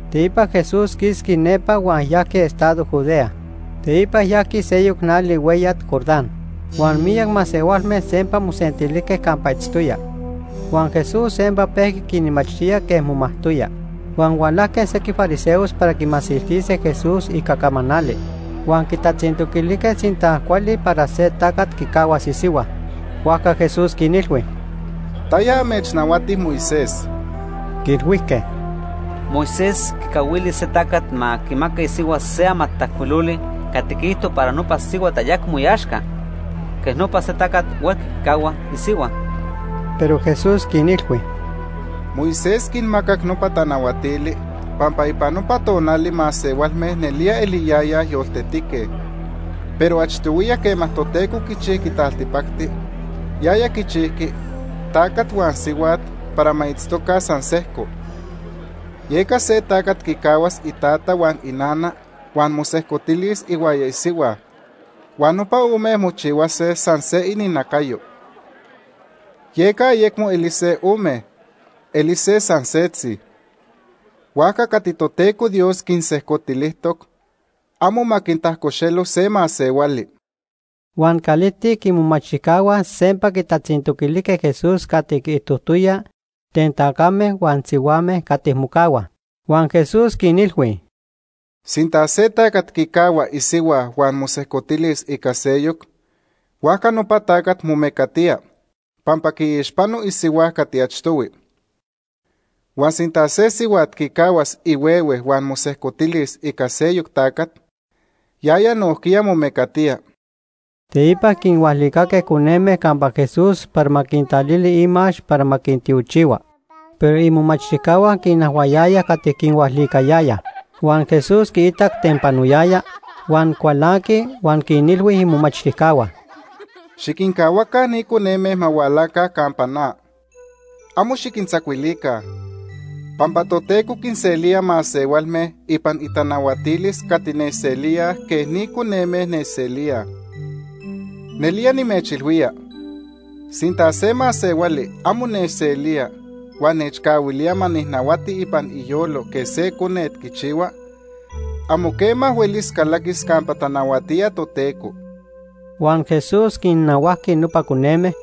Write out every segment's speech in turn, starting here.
Teipa Jesús quisqui nepa huan yajqui estado Judea. Teipa yajqui seyoc nali hueyat Jordán, huan miyac masehualme sempa mosentilijque campa itztoya. Huan Jesús sempa pejqui quinmachtía quej momajtoya. Huan hualajque sequij fariseos para quimasiltise Jesús ica camanali. Huan quitatzintoquilijque sinta cuali para se tacat quicahuas isihua. Huajca Jesús quinilhui: ―¿Taya amechnahuati Moisés? Quiilhuijque: ―Moisés quicahuili se tacat ma quimaca isihua se amatajcuiloli cati quiijto para nopa sihuat ayecmo iaxca. Quej nopa se tacat huelqui quicahua isihua. Pero Jesús quinilhui: ―Moisés quinmacac nopa tanahuatili pampa ipan nopa tonali masehualme nelía eliyayaj yoltetique, pero achtohuiya quema Toteco quichijqui taltipacti, yaya quichijqui ‘tacat huan sihuat para ma itztoca san sejco.’ Yeca se tacat quicahuas itata huan inana huan mosejcotilis ihuaya isihua, huan nopa ome mochihuase san se ininacayo. Yeca ayecmo elise ome, elise san setzi. Huajca cati Toteco Dios quinsejcotilijtoc amo ma quintajcoxelo se masehuali. Huan calijtic imomachtijcahua sempa quitatzintoquilijque Jesús cati quiijtojtoya ten tacame huan sihuame cati mocahuaj. Huan Jesús quinilhui: ―Sinta se tacat quicahua isihua huan mosejcotilis ica seyoc, huajca nopa tacat momecatía pampa quiixpano isihua cati achtohui. Huan sinta se sihuat quicahuas ihuehue huan mosejcotilis ica seyoc tacat, yaya nojquiya momecatía. Teipa quinhualicaque coneme campa Jesús para ma quintalili imax para ma quintiochihua, pero imomachtijcahua quinajhuayayaj cati quinhualicayayaj. Huan Jesús quiitac ten panoyaya, huan cualanqui huan quinilhui imomachtijcahua: ―Xiquincahuaca ni coneme ma hualaca campa na. Amo xiquintzacuilica, pampa Toteco quinselía masehualme ipan itanahuatilis cati nechselíaj quej ni coneme nechselíaj. Nelía nimechilhuía, sinta se masehuali amo nechselía huan nechcahuilía ma nijnahuati ipan iyolo quej se conet quichihua, amo quema huelis calaquis campa tanahuatía Toteco. Huan Jesús quinnahuajqui nopa coneme,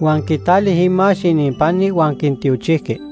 huan quitali imax ininpani huan quintiochijqui.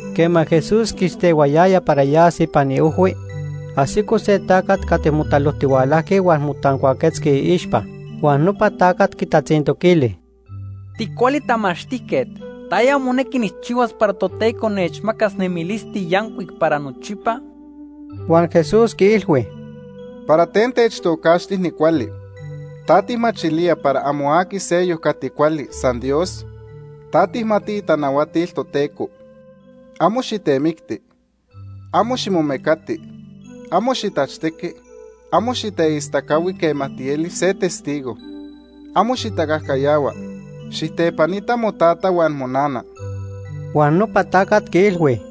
Quema Jesús quistehuayaya para yas ipan iojhui, ajsico se tacat cati motalojtihualajqui huan motancuaquetzqui iixpa. Huan nopa tacat quitatzintoquili: ―Ticuali tamachtijquet, ¿taya monequi nijchihuas para Toteco nechmacas nemilisti yancuic para nochipa? Huan Jesús quiilhui: ―¿Para ten techtocaxti nicuali? ¿Ta tijmachilía para amo aqui seyoc cati cuali, san Dios? Ta tijmati itanahuatil Toteco: ‘Amo xitemicti; amo ximomecati; amo xitachtequi; amo xiteistacahui quema tieli se testigo; amo xitacajcayahua; xijtepanita motata huan monana.’ Huan nopa tacat quiilhui: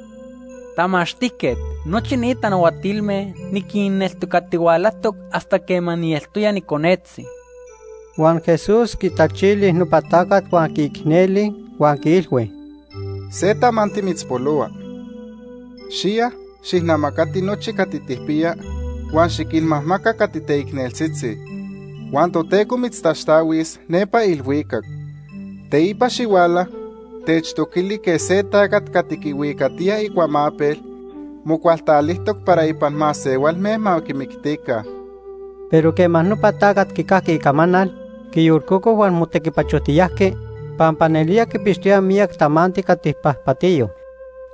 ―Tamachtijquet, nochi ni tanahuatilme niquinneltocatihualajtoc hasta quema nieltoya niconetzi. Huan Jesús quitachili nopa tacat huan quiicneli, huan quiilhui: ―Se tamanti mitzpolohua. Xiya, xijnamacati nochi cati tijpiya huan xiquinmajmaca cati teicneltzitzi. Huan Toteco mitztaxtahuis nepa ilhuicac. Teipa xihuala, techtoquili quej se tacat cati quihuicatiya icuamapel mocualtalijtoc para ipan masehualme ma quimictica. Pero quema nopa tacat quicajqui icamanal, quiyolcoco huan motequipachojtiyajqui, pampa nelía quipixtoya miyac tamanti cati pajpatiyo.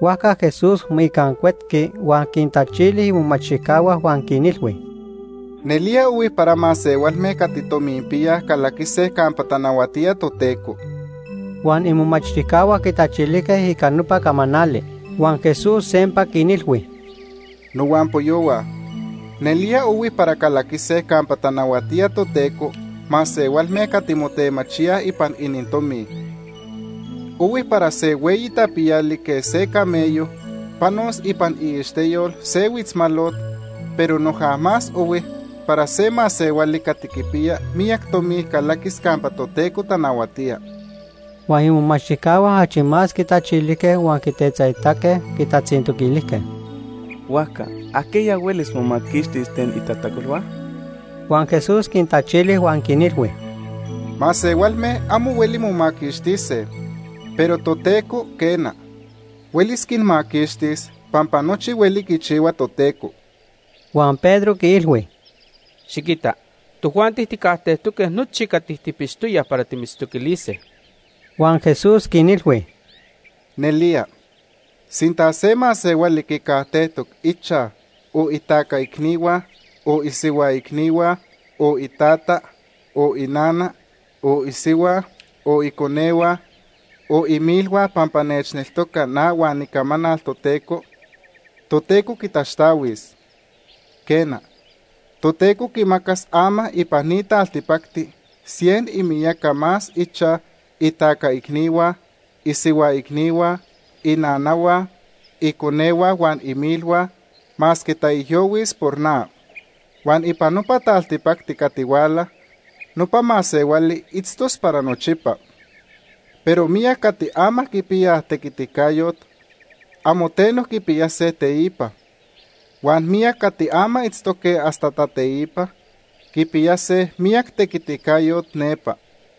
Huajca Jesús moicancuetqui huan quintachili imomachtijcahua huan quinilhui: ―¡Nelía ohui para masehualme cati tominpiyaj calaquise campa tanahuatía Toteco! Huan imomachtijcahua quitachilijque ica nopa camanali. Huan Jesús sempa quinilhui: ―Nohuampoyohua, nelía ohui para calaquise campa tanahuatía Toteco masehualme cati motemachíaj ipan inintomi. Ohui para se hueyi tapiyali quej se camello panos ipan iixteyol se huitzmalot, pero noja más ohui para se masehuali cati quipiya miyac tomi calaquis campa Toteco tanahuatía. Huan imomachtijcahua achi más quitachilijque huan quitetzaitaque quitatzintoquilijque: ―Huajca ¿ajquiya huelis momaquixtis ten itajtacolhua? Huan Jesús quintachili huan quinilhui: ―Masehualme amo hueli momaquixtise, pero Toteco, quena, huelis quinmaquixtis pampa nochi hueli quichihua Toteco. Huan Pedro quiilhui: ―Xiquita, tojuanti tijcajtejtoque nochi cati tijpixtoyaj para timitztoquilise. Huan Jesús quinilhui: ―Nelía, sinta se masehuali quicajtejtoc ichaj, o itaca icnihua, o isihua icnihua, o itata, o inana, o isihua, o iconehua, o imilhua, pampa nechneltoca na huan icamanal Toteco, Toteco quitaxtahuis. Quena, Toteco quimacas ama ipan ni taltipacti cien imiyaca más ichaj, itaca icnihua, isihua icnihua, inanahua, iconehua huan imilhua, masque taijyohuis por na. Huan ipan nopa taltipacti cati huala, nopa masehuali itztos para nochipa. Pero miyac cati ama quipiyaj tequiticayot, amo teno quipiyase teipa; huan miyac cati ama itztoque hasta tateipa, quipiyase miyac tequiticayot nepa.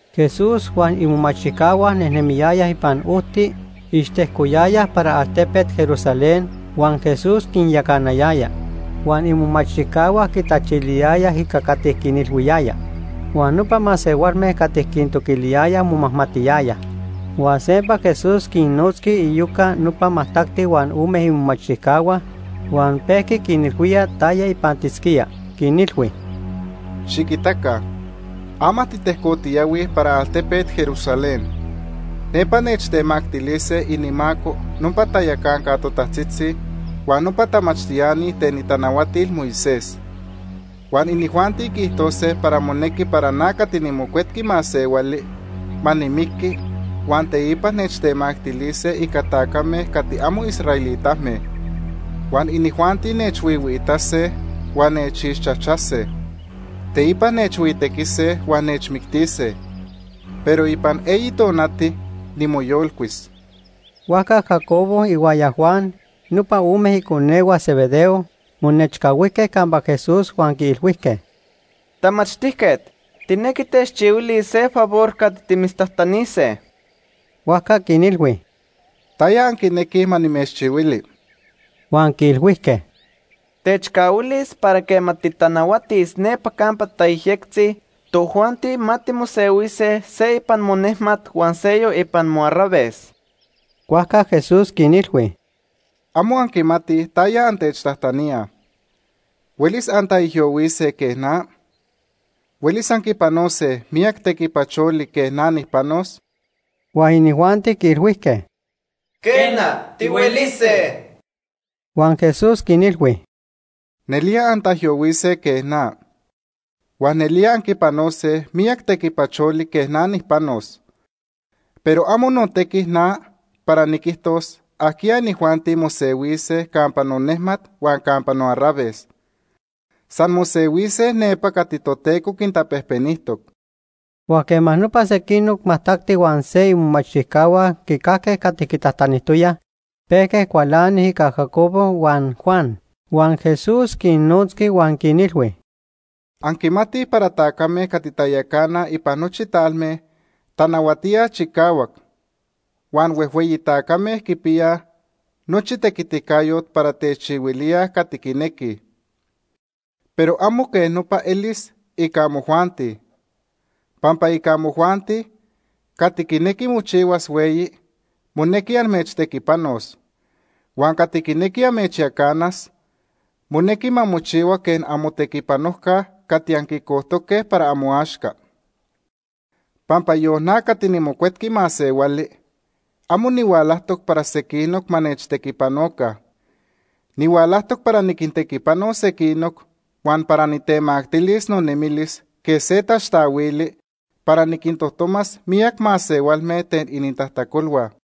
Jesús huan imomachtijcahua nejnemiyayaj ipan ojti ixtejcoyayaj para altepet Jerusalén huan Jesús quinyacanayaya. Huan imomachtijcahua quitachiliyayaj ica cati quinilhuiyaya, huan nopa masehualme cati quintoquiliyayaj momajmatiyayaj. Huan sempa Jesús quinnotzqui iyoca nopa majtacti huan ome imomachtijcahua huan pejqui quinilhuía taya ipantisquía. Quinilhui: “Xiquitaca, ama titejcotiyahuij para altepet Jerusalén. Nepa nechtemactilise inimaco nopa tayacanca totajtzitzi huan nopa tamachtiani ten itanahuatil Moisés. Huan inijuanti quiijtose para monequi para na cati niMocuetqui Masehuali ma nimiqui, huan teipa nechtemactilise ica tacame cati amo israelitame. Huan inijuanti nechhuihuiitase huan nechixchajchase. Teipa nechhuitequise huan nechmictise. Pero ipan eyi tonati, nimoyolcuis.” Huajca Jacobo ihuaya Juan, nopa ome iconehua Zebedeo, monechcahuijque campa Jesús huan quiilhuijque: ―Tamachtijquet, tijnequij techchihuilis se favor cati timitztajtanise. Huajca quinilhui: ―¿Taya anquinequij ma nimechchihuili? Huan quiilhuijque: ―Techcahuilis para quema titanahuatis nepa campa tayejyectzi, tojuanti ma timosehuise se ipan monejmat huan seyoc ipan moarraves. Huajca Jesús quinilhui: ―Amo anquimatij taya antechtajtaníaj. ¿Huelis antaijyohuise quej na? ¿Huelis anquipanose miyac tequipacholi quej na nijpanos? Huan inijuanti quiilhuijque: ―Quena, tihuelise. Huan Jesús quinilhui: ―Nelía antaijyohuise quej na. Huan nelía anquipanose miyac tequipacholi quej na nijpanos. Pero amo notequi na para niquijtos ajquiya inijuanti mosehuise campa nonejmat huan campa noarraves. San mosehuise nepa cati Toteco quintapejpenijtoc. Huan quema nopa sequinoc majtacti huan se imomachtijcahua quicajque cati quitajtanijtoyaj, pejque cualanij ica Jacobo huan Juan. Huan Jesús quinnotzqui huan quinilhui: ―Anquimatij para tacame cati tayacanaj ipan nochi talme tanahuatíaj chicahuac, huan huejhueyi tacame quipiyaj nochi tequiticayot para techihuilíaj cati quinequij. Pero amo quej nopa elis ica amojuanti. Pampa ica amojuanti, cati quinequi mochihuas hueyi, monequi amechtequipanos. Huan cati quinequi amechyacanas, monequi ma mochihua quej amotequipanojca cati anquicojtoque para amoaxca. Pampa yon na cati niMocuetqui Masehuali, amo nihualajtoc para sequinoc ma nechtequipanoca. Nihualajtoc para niquintequipanos sequinoc, huan para nitemactilis nonemilis quej se taxtahuili para niquintojtomas miyac masehualme ten inintajtacolhua.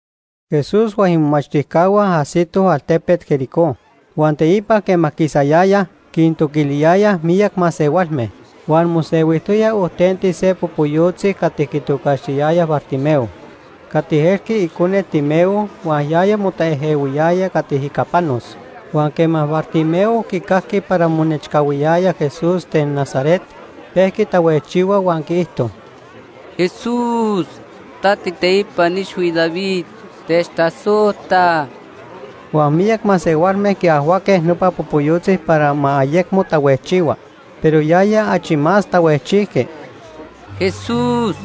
Jesús huan imomachtijcahua ajsitoj altepet Jericó. Huan teipa quema quisayayaj, quintoquiliyayaj miyac masehualme. Huan mosehuijtoya ojtenti se popoyotzi cati quitocaxtiyayaj Bartimeo cati elqui icone Timeo huan yaya motaejehuiyaya cati ica panos. Huan quema Bartimeo quicajqui para monechcahuiyaya Jesús ten Nazaret, pejqui tahuejchihua huan quiijto: ―¡Jesús, ta tiiteipan ixhui David, techtasojta! Huan miyac masehualme quiajhuaque nopa popoyotzi para ma ayecmo tahuejchihua, pero yaya achi más tahuejchijqui: ―¡Jesús,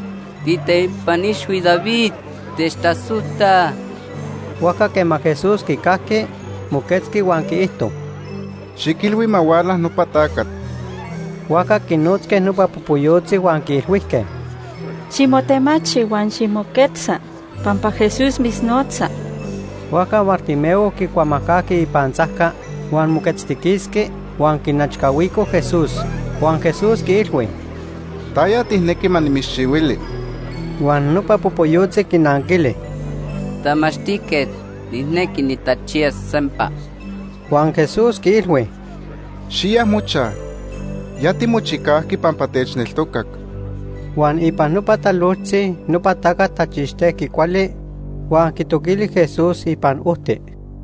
tiiteipan ixhui David, techtasojta! Huajca quema Jesús quicajqui, moquetzqui huan quiijto: ―Xiquilhui ma huala nopa tacat. Huajca quinotzque nopa popoyotzi huan quiilhuijque: ―Ximotemachi huan ximoquetza, pampa Jesús mitznotza. Huajca Bartimeo quicuamajcajqui ipantzajca, huan moquetztiquisqui, huan quinechcahuico Jesús. Huan Jesús quiilhui: ―¿Taya tijnequi ma nimitzchihuili? Huan nopa popoyotzi quinanquili: ―Tamachtijquet, nijnequi nitachiyas sempa. Huan Jesús quiilhui: ―Xiya mochaj, ya timochicajqui pampa techneltocac. Huan ipan nopa talojtzi nopa tacat tachixtejqui cuali, huan quitoquili Jesús ipan ojti.